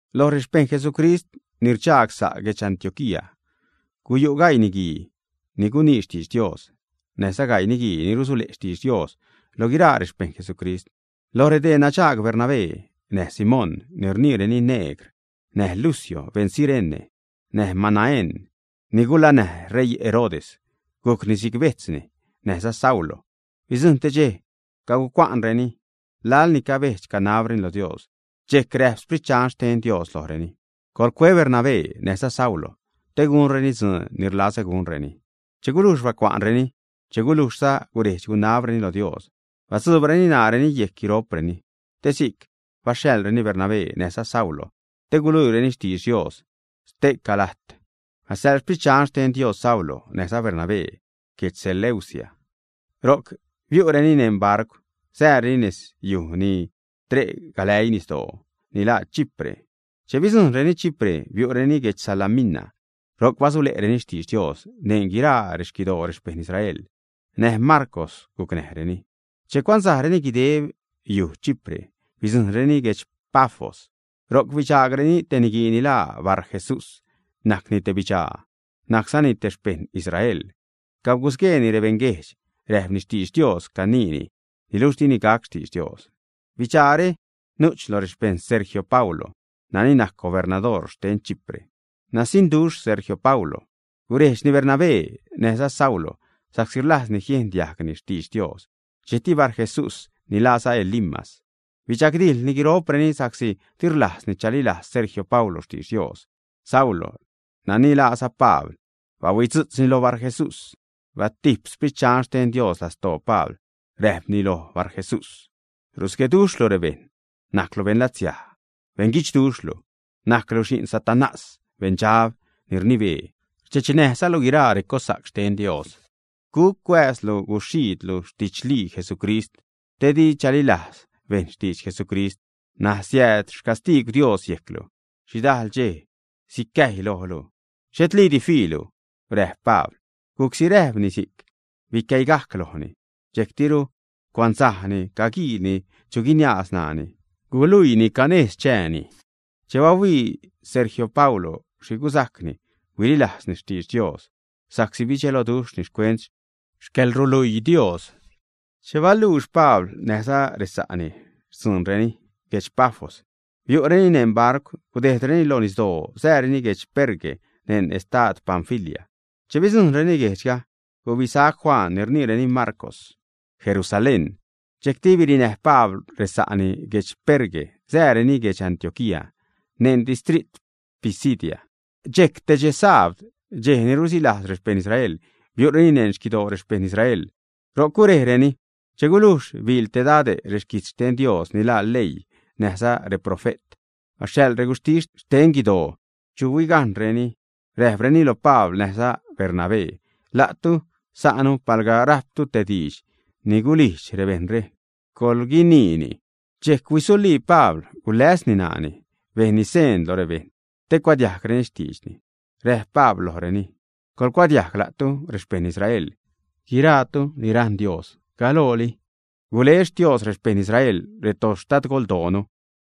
Lo rexpejṉ Jesucrist ni rdxaag sa' guedx Antioquía guyu' gaii niguii ni gunii xtidx Dios, näjza gaii niguii ni rusule' xtidx Dios loj guiraa rexpejṉ Jesucrist. Loj redee nadxaag Bernabé, näj Simón ni rniireni Negr; näj Lucio, beṉ Cirene; näj Manaén ni gulanäj ṟeii Herodes gujcni si'c bejtzni; näjza Saulo. Bidzujṉ te dxej cagucua'nreni laḻ ni cabedx-canabreni lo Dios, dxejc räjp Sprit Dxan xten Dios lojreni: ―Coḻcue Bernabé näjza Saulo te gunreni dzuun ni rlazä gunreni. Che gulujx bacua'nreni, che gulujxza guredx-gunabreni lo Dios, batzuubreni ṉaareni yejc guiro'preni, te si'c baxhaḻreni Bernabé näjza Saulo te guluiireni xtidx Dios ste'ca lajt. Baxhaḻ Sprit Dxan xten Dios Saulo näjza Bernabé guedx Seleucia. Ro'c biu'reni neṉ barcw, sääreni nez yuj ni tre' galäii nisdoo, ni laa Chipre. Che bidzujṉreni Chipre, biu'reni guedx Salamina. Ro'c basule'reni xtidx Dios neṉ guiraa rexquidoo rexpejṉ Israel. Näj Marcw gucnäjreni. Che cuansajreni guideb yuj Chipre, bidzujṉreni guedx Pafos. Ro'c bidxaagreni te niguii ni laa Barjesús. Najcni te bidxaa, najczani te xpejṉ Israel. Cagusgueeni rebejṉ guejdxga, räjpni xtidx Dios caniini, niluxh dini gac xtidx Dios. Bidxaare nu'ch lo rexpejṉ Sergio Paulo, nani najc gubernadoor xten Chipre. Nasiṉduxh Sergio Paulo. Gurejdxni Bernabé näjza Saulo, sa'csi rlajzni jiejn diajgni xtidx Dios. Dxejcti Barjesús, ni laaza Elimas, bidxagdijḻni guiro'preni sa'csi di rlajzni chalilajz Sergio Paulo xtidx Dios. Saulo, nani laaza Pabl, bahuitzu'tz loj Barjesús. Batijp Sprit Dxan xten Dios lastoo Pabl, räjpni loj Barjesús: ―Rusgueduxhlu rebejṉ, najclu beṉlatsiaj, beṉguidxduxhlu, najclu xi'n Satanás, beṉdxab ni rnibee. Rdxechnäjzalu guiraa recossa'c xten Dios. ¿Guc cuääz guxhiidlu xtidxlii Jesucrist te di chalilajz bejṉ xtidx Jesucrist? N̲aj siääd xcastiigw Dios yejclu. Xhidajl dxej sicäjy lojlu, xhetliidi fiilu ―räjp Pabl. Gujcsi räjpni si'c, bicäigajc lojni. Dxejctiru cuansajni caguiilni chu guiniaaz ṉaani guluiini canejz chääni. Che bahuii Sergio Paulo xhi gusajcni, huililajzni xtidx Dios, sa'csi bidxeloduxhni xcuent xcäḻruluii Dios. Che baluux Pabl näjza resa'ni xtzuunreni guedx Pafos, biu'reni neṉ barcw, gudejdreni lo nisdoo, sääreni guedx Perge neṉ estad Panfilia. Che bidzujṉreni guejdxga, gubisac Juan, ni rniireni Marcw, Jerusalén. Dxejcti birinäj Pabl resa'ni guedx Perge, sääreni guedx Antioquía neṉ distrit Pisidia. Dxejc te dxe sabd, dxej ni rusilajz rexpejṉ Israel, biu'reni neṉ xquidoo rexpejṉ Israel, ro'c gurejreni. Che gulujx biḻ te dade' reguijtz xten Dios ni laa leii näjza reprofe't, baxhaḻ reguxhtis xten guidoo chu huigajṉreni, räjpreni lo Pabl näjza Bernabé: ―La'tu sa'nu, palga rajptu te diidx ni gulijdx rebejṉre, coḻguiniini. Dxejc huisulii Pabl, guläsni ṉaani bejnni seen lo rebejṉ te cuadiajgreni xtiidxni. Räjp Pabl lojreni: ―Coḻcuadiajg, la'tu rexpejṉ Israel, guiraatu ni rajṉ Dios. Galooli gule Xtios rexpejṉ Israel retoxtadgoldoonu.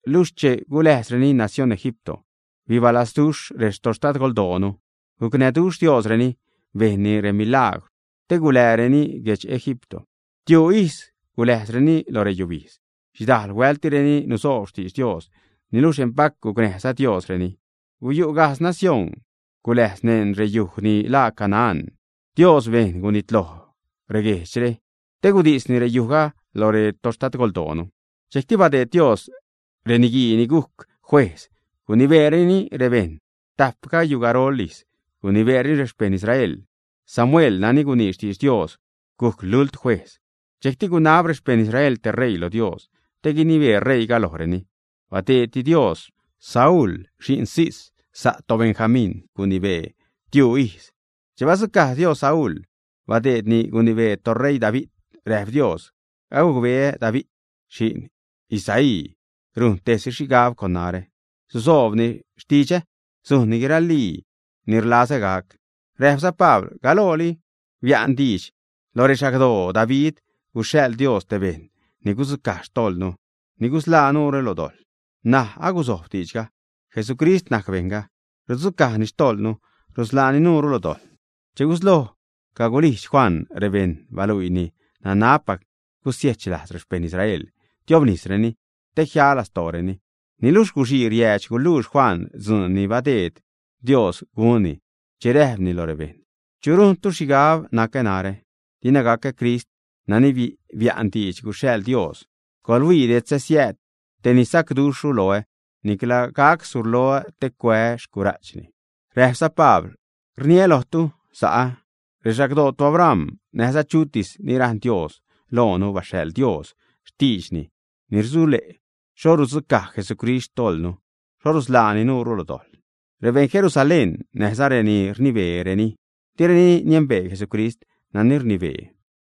Luxh che guläjzreni nacióṉ Egipto, bidalduxh retoxtadgoldoonu. Gucnäjduxh Diosreni bejnni remilagwr, te guḻäänireni guedx Egipto. Tiuu ijz guläjzreni lo reyubijdz. Xhidajl huält direni nusoob xtidx Dios, niluxh empac gucnäjza Diosreni. Guyu' gajtz nacióṉ guläjz neṉ reyuj ni laa Canaán. Dios bejn gunitloj reguejdxre, te gudisni reyujga loj retoxtadgoldoonu. Dxejcti badeed Dios reniguii ni gujc juejz, gunibeereni rebejṉ. Tajp gayugarol ijz gunibeereni rexpejṉ Israel. Samuel nani gunii xtidx Dios gujc lult juejz. Dxejcti gunab rexpejṉ Israel te ṟeii lo Dios te guinibee ṟeiiga lojreni. Badeedti Dios Saúl xi'n Cis, sa' toBenjamín. Gunibeeni tiuu ijz. Che badzucaj Dios Saúl, badeedni gunibee toṟeii David. Räjp Dios: “Agucbeä David xi'n Isaí rujn tejsi xhigab con narä. Susoobni xtidxä sujnni guiralii ni rlazä gac.” Räjpza Pabl: ―Galooli bia'n diidx lo rexagdoo David guxhaḻ Dios te bejṉ ni gudzucaj xtojḻnu, ni gusḻaa nuure lo dojḻ. N̲aj aguzojb diidxga. Jesucrist najc bejṉga, rudzucajni xtojḻnu, rusḻaani nuure lo dojḻ. Che gusloj cagulijdx Juan rebejṉ, baluiini nanabpac gusiechlajz rexpejṉ Israel, tiobnisreni te jia xtojḻreni. Niluxh guxii riäädx guluux Juan dzuun ni badeed Dios gunni che räjpni lo rebejṉ: “¿Chu rujntu xhigab nacä narä? Dina gacä Crist nani bia'n diidx guxhaḻ Dios. Coḻhuii, detzä siääd tej ni sacduxhru loä; nicla gac surloä te cuää́ xcura'chni.” Räjpza Pabl: ―Rniä lojtu sa'ä, rexagdoo toAbram, näjza lo chutis ni rajṉ Dios, loonu baxhaḻ Dios xtiidxni ni rusule' xho rudzucaj Jesucrist xtojḻnu, xho rusḻaani nuunu lo dojḻ. Rebejṉ Jerusalén, näjza renani rnibeereni, direni niembee Jesucrist nani rnibee,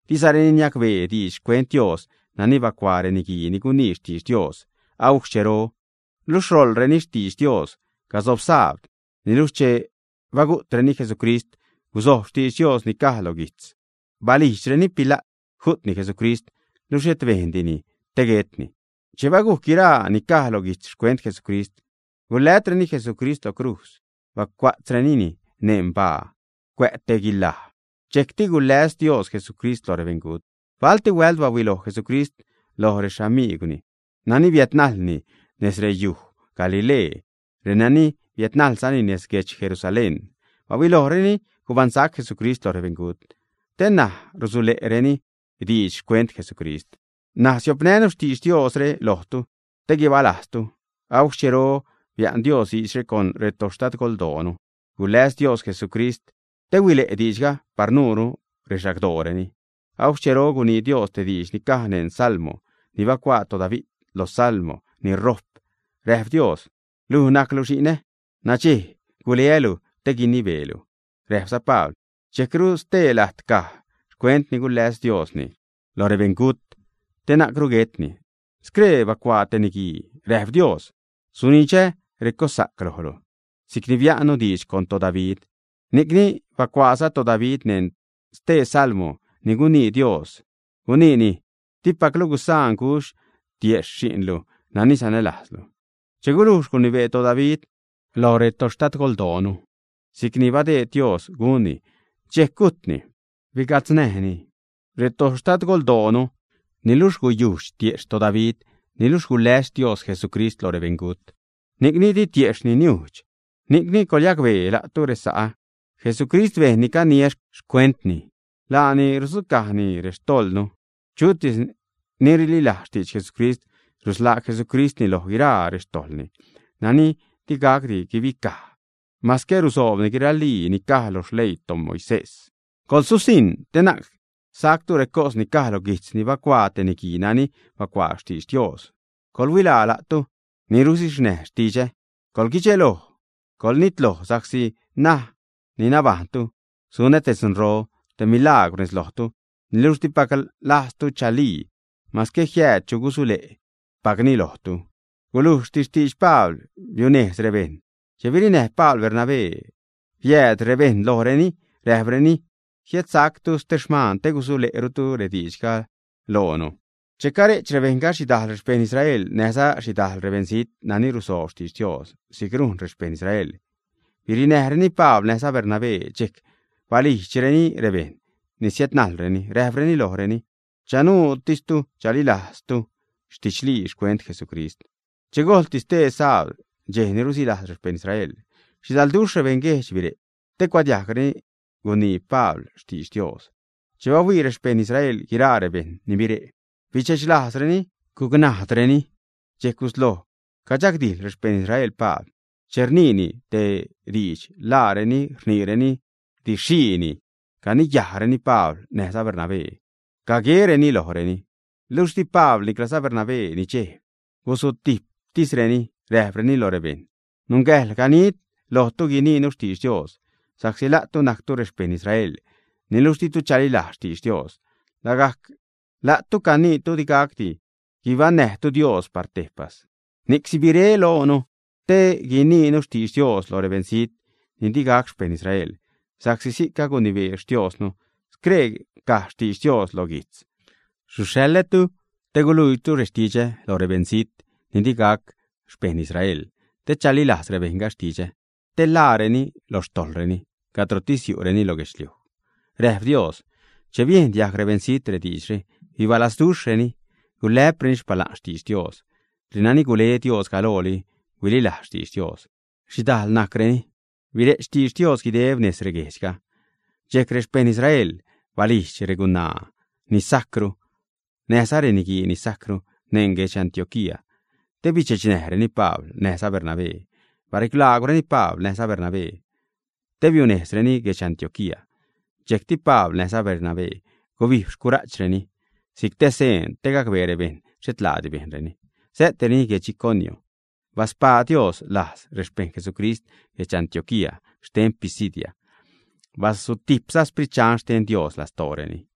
dizareni niacbee diidx xcuent Dios nani bacuaa reniguii ni gunii xtidx Dios agujc xchero, luxh ṟoḻreni xtidx Diosga gasob sabd. Niluxh che bagu'treni Jesucrist, guzojb xtidx Dios ni caj lo guijtzga. Balijdxreni Pila't ju'tni Jesucrist, luxh xhet bejndini te guetni. Che bagujc guiraa ni caj lo guijtz xcuent Jesucrist, gulätreni Jesucrist lo crujz, bacua'tzrenini neṉ baa cuä' te guilaj. Dxejcti guläs Dios Jesucrist lo rebeṉgut. Balti huält baluiloj Jesucrist lo rexamigwni nani biädnajlni nez rexyuj Galilee, renani biädnajlzani nez guedx Jerusalén. Bahuilojreni gubaṉsac Jesucrist lo rebeṉgut, te ṉaj rusule'reni diidx xcuent Jesucrist. ’N̲aj siopnänu xtidx Diosre lojtu te guibalajztu. Agujc xchero bia'n Dios diidxre con retoxtadgoldoonu. Guläs Dios Jesucrist te huile' diidxga par nuure, rexagdooreni. Agujc xchero gunii Dios te diidx ni caj neṉ Salmo ni bacuaa toDavid. Lo Salmo ni rojp räjp Dios: “Luj najclu xi'nä. Nadxej guleälu te guinibeelu.” Räjpza Pabl: ―Dxejcru stee lajt caj xcuent ni guläs Diosni lo rebeṉgut te nuncru guetni. Scree bacuaa te niguii, räjp Dios: “Sunidxä recossa'c lojlu si'c ni bia'nä diidx con toDavid.” Ni'cni bacuaaza toDavid neṉ stee Salmo ni gunii Dios, guniini: “Dipaclu gusaan gudx tiejxh Xi'nlu nani sanälajzlu.” Che gulujx gunibee toDavid lo retoxtadgoldoonu, si'cni badeed Dios gunni, dxejc gujtni. Biga'tznäjni retoxtadgoldooni. Niluxh guyujdx tiejxh toDavid. Niluxh guläs Dios Jesucrist lo rebeṉgut, ni'c di tiejxhni niujdx. Ni'cni coḻyacbee, la'tu resa'ä, Jesucristre, bejṉ ni caniä xcuentni, laani rudzucajni rextojḻnu. Chutis ni rililajz xtidx Jesucrist rusḻaa Jesucristni loj guiraa rextojḻni nani digacdi guibicaj mascä rusoobni guiralii ni caj lo leii xten toMoisés. Coḻsusiṉ te na'c sajctu recos ni caj lo guijtz ni bacuaa te niguii nani bacuaa xtidx Dios: Coḻhuilaa, la'tu ni ruxhiznäj xtidxä coḻguidxeloj, coḻnitloj, sa'csi ṉaj ni nabajṉtu sunä te dzunro, te milagwr nez lojtu, niluxh dipac lajztu chalii, mascä jiääd chu gusule'pacni lojtu. Gulujxti xtidx Pabl, biunejz rebejṉ. Che birinäj Pabl Bernabé biädnii rebejṉre lojreni, räjpreni: ―Jiädsactu ste xmaan te gusule'rutu rediidxre loonu. Che care'ch rebejṉga, xhidajl rexpejṉ Israel, näjza xhidajl rebeṉzijt nani rusoob xtidx Dios si'c rujn rexpejṉ Israel, birinajlreni Pabl näjza Bernabé. Dxejc balijdxreni rebejṉ ni siädnajlreni, räjpreni lojreni chanuutis chalilajzreni didxlii xcuent Jesucrist. Che gojlti stee sabd, dxej ni rusilajz rexpejṉ Israel, xhidalduxh rebeṉguejdx bire' te gucuadiajgreni guinii Pabl xtidx Dios. Che bahuii rexpejṉ Israel guiraa rebejṉ ni bire', bidxechlajzreni, gucnadareni. Dxejc gusloj cadxagdijḻ rexpejṉ Israel Pabl. Che rniini te diidx, laareni rniireni “didxxhiini”. Caniyajzareni Pabl näjza Bernabé, caguereni lojreni. Luxh di Pabl niclaza Bernabé nidxejb. Gusutijptisreni, räjpreni lo rebejṉ: ―Nungäjḻ ganid lojtu guiniinu xtidx Dios, sa'csi la'tu najctu rexpejṉ Israel. Niluxh ditu chalilajz xtidx Dios, lagajc la'tu caniitu digacdi guibaṉnäjtu Dios par tejpas. Ni'c sibiré loonu, te guiniinu xtidx Dios lo rebeṉzijt ni digac xpejṉ Israel. Sa'csi si'c agunibee Xtiosnu. Scree caj xtidx Dios lo guijtz: Suxhaḻätu te guluiilu rextidxä lo rebeṉzijt ni digac xpejṉ Israel, te chalilajz rebejṉga xtidxä, te ḻaareni lo xtojḻreni, cadrotis yu'reni lo guedxliuj, räjp Dios. Che biejn diajg rebeṉzijt rediidxre, bibalazduxhreni, gulä'preni xpala'n xtidx Dios. Renani gule Dios galooli huililajz xtidx Dios. Xhidajl najcreni. Bire'ch xtidx Dios guideb nez reguejdxga. Dxejc rexpejṉ Israel balijdx regunaa ni sajcru, näjza reniguii ni sajcru neṉ guedx Antioquía, te bidxechnäjreni Pabl näjza Bernabé, barilaagwreni Pabl näjza Bernabé te biunejzreni guedx Antioquía. Dxejcti Pabl näjza Bernabé gubijb guxhuj ni'reni si'c te seen te gacbee rebejṉ xhet laadi bejnreni. Sä'tireni guedx Iconio. Baspaa Dios lajz rexpejṉ Jesucrist guedx Antioquía xten Pisidia. Bazutijpza Sprit Dxan xten Dios lastooreni.